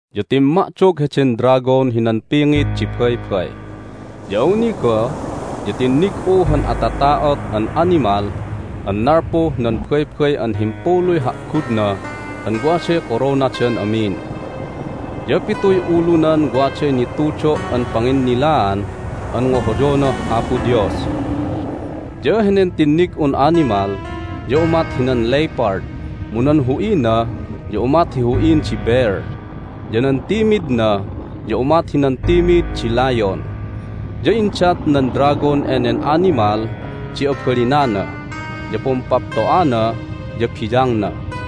Ya timma'dog heden dragon hinan pingit di baybay. Ya awni goh ya tinnig'u han atata'ot an animal an nalpuh nan baybay an himpuluy ha'gudna an waday koronadan amin. Ya pituy ulunan waday nitudo' an panginnilaan an ngohoyonah Apo Dios. Ya henen tinnig'un animal ya umat hinan lepard, mu nan hu'ina ya umat hi hu'in di bear, ya nan timidna ya umat hinan timid di layon. Ya indat nan dragon enen animal di abalinana, ya pumpapto'ana, ya biyangna.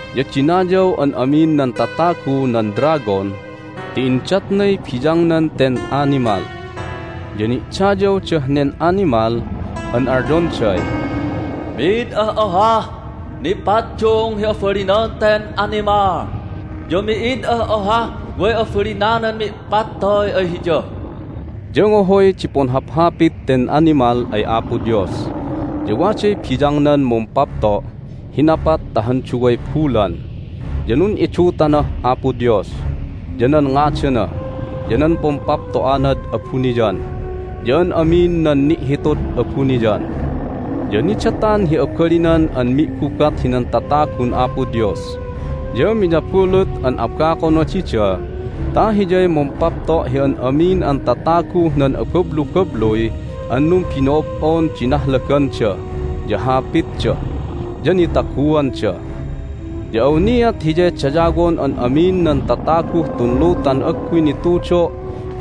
Ya dinayaw an amin nan tatagu nan dragon ti indatnay biyangnan ten animal. Ya ni'dayawdah nen animal an alyonday, "Mid ah ohah nipaddung hi abalinan ten animal! Ya mi'id ah ohah way abalinanan mi'pattoy ay hiya!" Ya ngohoy di punhaphapit ten animal ay Apo Dios, ya waday biyangnan mumpapto' hi napat ta han duway bulan. Ya nun'idutanah Apo Dios, ya nan ngadana, ya nan pumpapto'anad abuniyan, ya an amin nan ni'hitud abuniyan. Ya nidatan hi abalinan an mi'gubat hinan tatagun Apo Dios, ya miyabulut an abakona dida ta hiyay mumpapto' hi an amin an tataguh nan abablubabluy an numbino'ob'on di nahlaganda, ya hapitda, ya nitaguanda. Ya awniat hiyay dayawon an amin nan tataguh tun lutan agguy nitudo'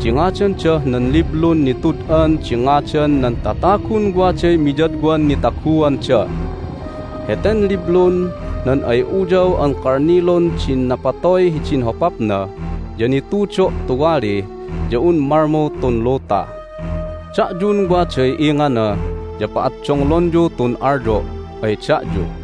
di ngadandah nan Liblun Nitud'an di Ngadan nan Tatagun Waday Miyadwan Nitaguanda. Heten liblun nan ay Uyaw an Kalnilun din napatoy hidin hopapna ya nitudo' tuwali ya un malmu tun luta. Da'yun waday ingana ya pa'addonglonyu tun alyo' ay da'yu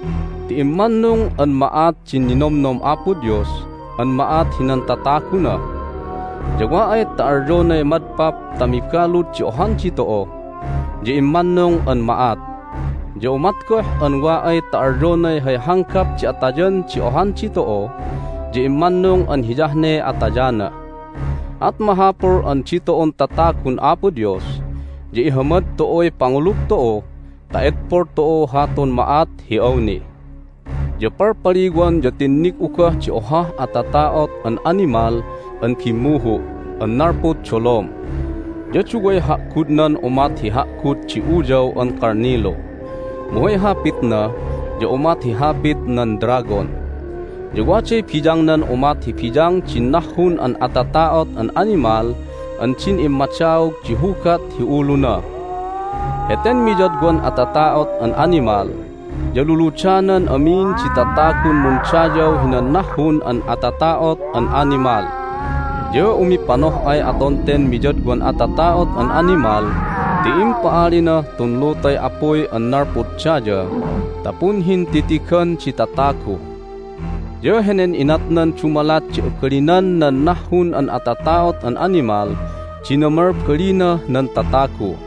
ti immannung an ma'at din ninomnom Apo Dios an ma'at hinan tataguna! Ya wa ay ta alyonay madpap ta mibalud di ohan ditu'u ya immannung an ma'at. Ya umat goh an wa ay ta alyonay hay hanggap di atayan di ohan ditu'u ya immannung an hiyah ne atayana. At mahapul an ditu'un tatagun Apo Dios ya ihamad tu'uy pangulug tu'u ta edpol tu'u hatun ma'at hi awni. Ya palpaliwan ya tinnig'u goh di ohah atata'ot an animal an bimmuhu' an nalpud dolom. Ya duway ha'gudnan umat hi ha'gud di uyaw an kalnilu, mu hay hapitna ya umat hi hapit nan dragon. Ya waday biyangnan umat hi biyang din nahhun an atata'ot an animal an din immadaog di hugat hi uluna. Heten miyadwan atata'ot an animal ya luludanan amin di tatagun mundayaw hinan nahhun an atata'ot an animal. Ya umipanoh'ay aton ten miyadwan atata'ot an animal ti impa'alinah tun lutay apuy an nalpud daya ta punhintitigan di tatagu. Ya henen inatnan dumalat di abalinan nan nahhun an atata'ot an animal di namalbalinah nan tatagu.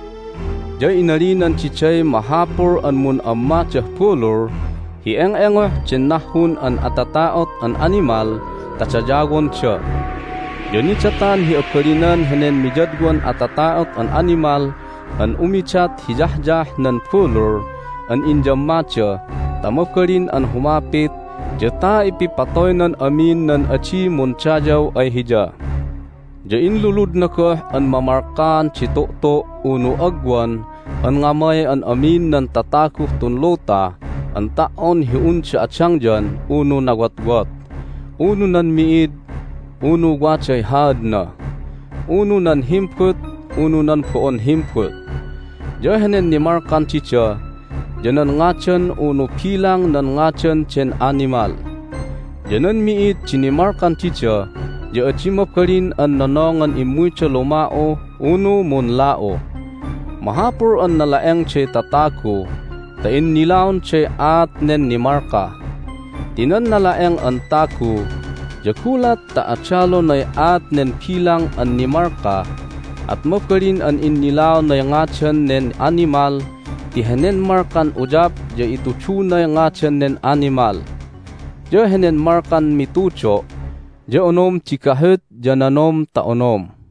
Ya inalinan diday mahapul an mun'ammadah bulul hi eng'engoh den nahhun an atata'ot an animal ta dayawonda. Ya nidatan hi abalinan henen miyadwan atata'ot an animal an umidat hi yahyah nan bulul an inyammada ta mabalin an humapit ya ta ipipatoynan amin nan adi mundayaw ay hiya. Ya inluludna goh an mamalkaan di tu'tu' unu agwan an ngamay an amin nan tataguh tun luta an ta"on hi unda adangyan unu nawotwot, unu nan mi'id unu waday haadna, unu nan himbut unu nan bo'on himbut. Ya henen nimalkan dida ya nan ngadan unu bilang nan ngadan den animal. Ya nan mi'id di nimalkan dida ya adi mabalin an nonongan immuyda luma'u unu munla'u. Mahapul an nala'engday tatagu ta innilaonday aat nen nimalka. Ti nan nala'eng an tagu ya gulat ta adalonay aat nen bilang an nimalka at mabalin an innilaonay ngadan nen animal ti henen malkan uyap ya itudunay ngadan nen animal. Ya henen malkan mitudo' ya onom di gahut ya nanom ta onom.